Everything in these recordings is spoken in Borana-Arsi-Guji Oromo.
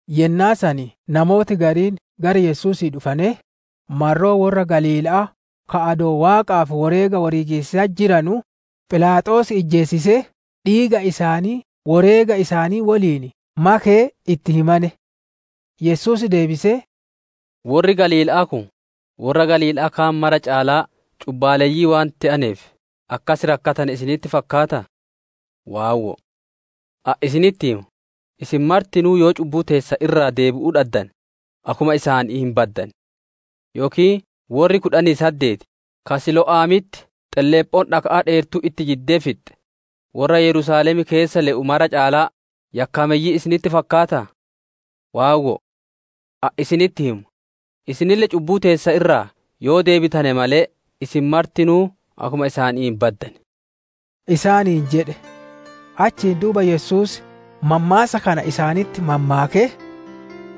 Yennaa san namooti gariin gara Yesuusii dhufanee, marroo worra Galiila'aa ka adoo Waaqaaf woreega woreegiisatti jiranuu, Philaaxoos ijjeesisee dhiiga isaanii woreega isaanii woliin makee itti himane. Yesuus deebisee, «Worri Galiila'aa kun, worra Galiila'aa kaan mara caalaa cubbaaleyyii waan te'aneef akkas rakkatane isinitti fakkaataa? Waawwoo! Ani isinitti hima, isin martinuu yoo cubbuu teessan irraa deebi'uu dhaddane, akkuma isaanii hin baddan. Yookiin worri kudhanii saddeeti ka Siilo'amitti xelleephoon dhaka'aa dheertuun itti jiddee fixxe, worra Yerusaalem keessa le'u mara caalaa yakkaameyyii isinitti fakkaataa? Waawwo'o! Ani isinitti hima; isinille cubbuu teessan irraa yoo deebitane malee, isin martinuu akkuma isaanii hin baddan» isaaniin jedhe. Achiin duuba Yesuus mammaassa kana isaanitti mammaakee,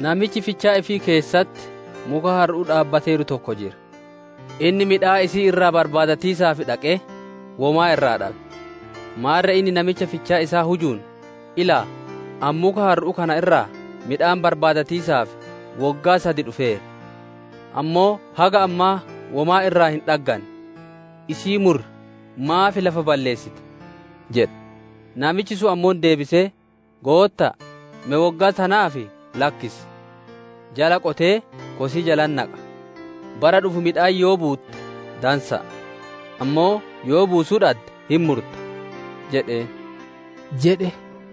«Namichi fichaa ifii keessatti muka harru'uu dhaabbateeru tokko jira. Inni midhaan isii irraa barbaadatiisaaf dhaqee womaa irraa dhabe. Maarre inni namicha fichaa isaa hujuun, ‹Ilaa, ani muka harru'uu kana irraa midhaan barbaadatiisaaf woggaa sad dhufeera; ammoo haga ammaa womaa irraa hin dhagganne. Isii muri, maaf lafa balleessiti?› jedhe. Namichi sun ammoo deebisee, ‹Gootta'a, me woggaa tanaaf lakkis; jala qotee kosii jalatti naqa. Bara dhufu midhaan yoo buutte dansa'a! Ammoo yoo buusuu dhadde hin murta!› jedheen» jedhe.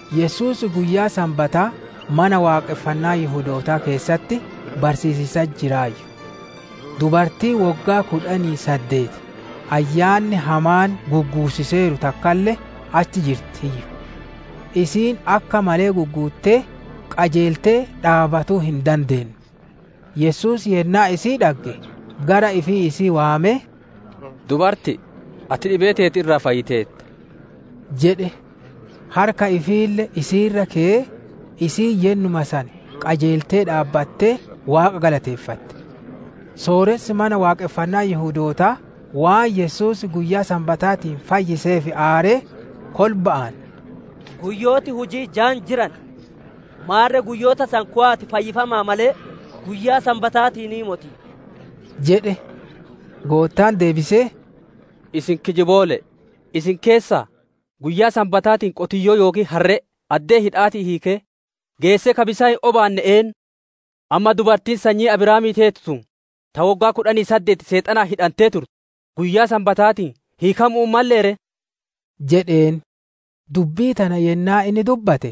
Yesuus Guyyaa Sanbataa Mana Waaqonfannaa Yihudootaa keessatti barsiisiisatti jiraayyu. Dubartiin woggaa kudhanii saddeeti ayyaanni hamaan gugguussiseeru takkalle achi jirtiiyyu. Isiin akka malee gugguuttee qajeeltee dhaabbatuu hin dandeenne. Yesuus yennaa isii dhagge gara ifii isii waamee, «Dubarti'i, ati dhibee teeti irraa fayyiteerta» jedhe. Harka ifiille isii irra keyee, isiin yennuma san qajeeltee dhaabbattee Waaqa galateeffatte. Sooressi mana Waaqonfannaa Yihudootaa waan Yesuus guyyaa Sanbataatiin fayyiseef aaree, kolba'aan, «Guyyooti huji'ii jaan jiran. Maarre guyyoota san kowa'aatii fayyifama'a malee, guyyaa Sanbataatiinii moti» jedhe. Goottaan deebisee, «Isin kijiboole'e, isin keessaa guyyaa Sanbataatiin qotiyyoo yookiin harree addee hidha'aatii hiikee geessee ka bisaan hin obaanne eennu? Amma dubartiin sanyii Abrahaamii teetu tun, ta woggaa kudhanii saddeeti Seexanaan hidhantee turte, guyyaa Sanbataatiin hiikamu'uu hin mallee ree?» jedheen. Dubbii tana yennaa inni dubbate,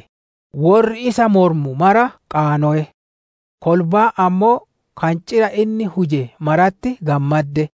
worri isa mormu mara qaanowe; kolbaan ammoo kancira inni huje maratti gammadde.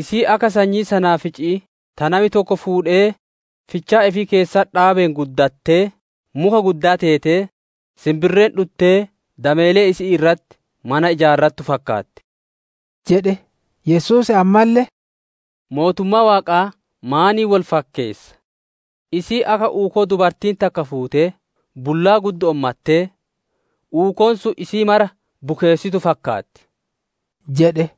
Isiin akka sanyii sanaafici'ii ta nami tokko fuudhee fichaa ifii keessatti dhaabeen guddattee muka guddaa teetee, sinbirreen dhuttee dameelee isi'ii irratti mana ijaarrattuu fakkaatti» jedhe. Yesuus ammalle, «Mootummaa Waaqaa maaniin wol fakkeessa? Isiin akka uukoo dubartiin takka fuutee bullaa guddo'oon mattee, uukoon sun isii mara bukeessituu fakkaatti» jedhe.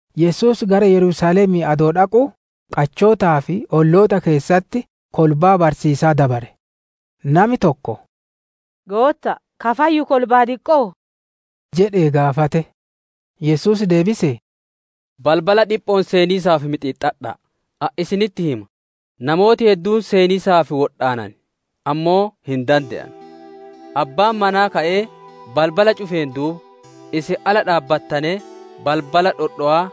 Yesuus gara Yerusaalemii adoo dhaquu, qachootaa fi olloota keessatti kolbaa barsiisaa dabare. Nami tokko, «Gootta'a, ka fayyu kolbaa diqqo'oo?» jedhee gaafate. Yesuus deebisee, «Balbala dhipho'oon seeniisaaf mixiixxadha'a; ani isinitti hima; namooti hedduun seeniisaaf wodhaanan; ammoo hin dande'anu. Abbaan manaa ka'ee balbala cufeen duuba, isin ala dhaabbatanee balbala dhodhowaa,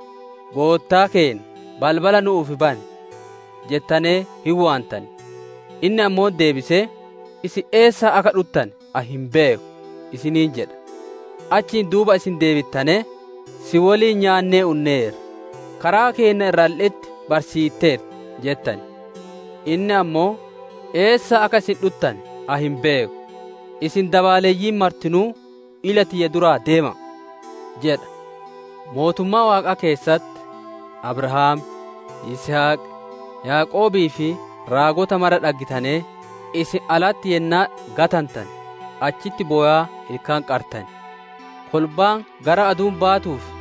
‹Goottaa keenna balbala nu'uuf bani!› jettanee hin waantan; inni ammoo deebisee, ‹Isin eessaa akka dhuttane ani hin beeku› isiniin jedha. «Achiin duuba isin deebittanee, ‹Si woliin nyaannee unneerra; karaa keenna irralle'etti barsiitteerta› jettan. Inni ammoo, ‹Eessaa akka isin dhuttane ani hin beeku; isin dabaaleyyiin martinuu ila tiyya duraa deema'a!› jedha. Mootummaa Waaqaa keessatti, Abrahaam, Yisihaq, Yaaqoobii fi raagota mara dhaggitanee, isin alatti yennaa gatantane, achitti bowaa ilkaan qartan. Kolbaan gara aduun baatuu fi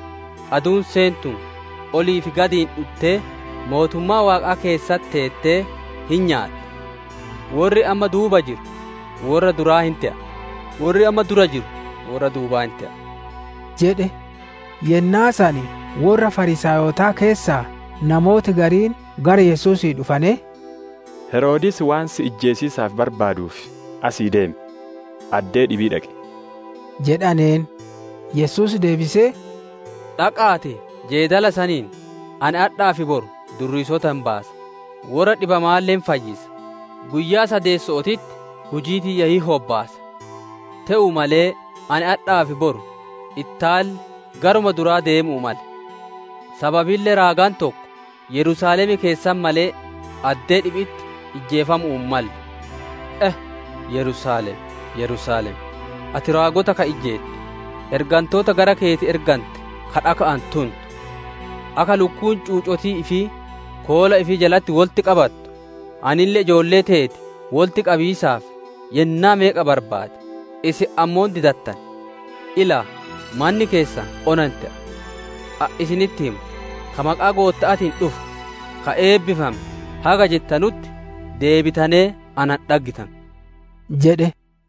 aduun seentuun, olii fi gadiin dhuttee mootummaa Waaqaa keessa teettee hin nyaatti. Worri amma duuba jiru, worra duraa hin te'a; worri amma dura jiru worra duubaa hin te'a» jedhe. Yennaa san worra Fariisaayotaa keessaa namooti gariin gara Yesuusii dhufanee, «Heroodis waan si ijjeesiisaaf barbaaduuf asii deemi, addee dhibii dhaqi!» jedhaneen. Yesuus deebisee, «Dhaqa'aatii jeedala saniin, Ani adhaa fi boru durriisota hin baasa, worra dhibamaalle hin fayyisa, guyyaa sadeesso'ootitti hujii tiyya hin hobbaasa. Te'uu malee, ani adhaa fi boru, ittaanille garuma duraa deemuu male; sababille raagaan tokko Yerusaalem keessatti malee, addee dhibi'itti ijjeefamuu hin malle» isaaniin jedhe. «E! Yerusaalem, Yerusaalem! Ati raagota ka ijjeettu, ergantoota gara keeti ergante ka dhaka'aan tuntu! Akka lukkuun cuucotii ifii koola ifii jalatti wolitti qabattu, anille ijoollee teeti wolitti qabiisaaf yennaa meeqa barbaade, isin ammoo didattane. Ilaa, manni keessan ona hin te'a. Ani isinitti hima, ‹Ka maqaa Gootta'aatiin dhufu, ka eebbifame› haga jettanutti deebitanee na hin dhaggitanu» jedhe.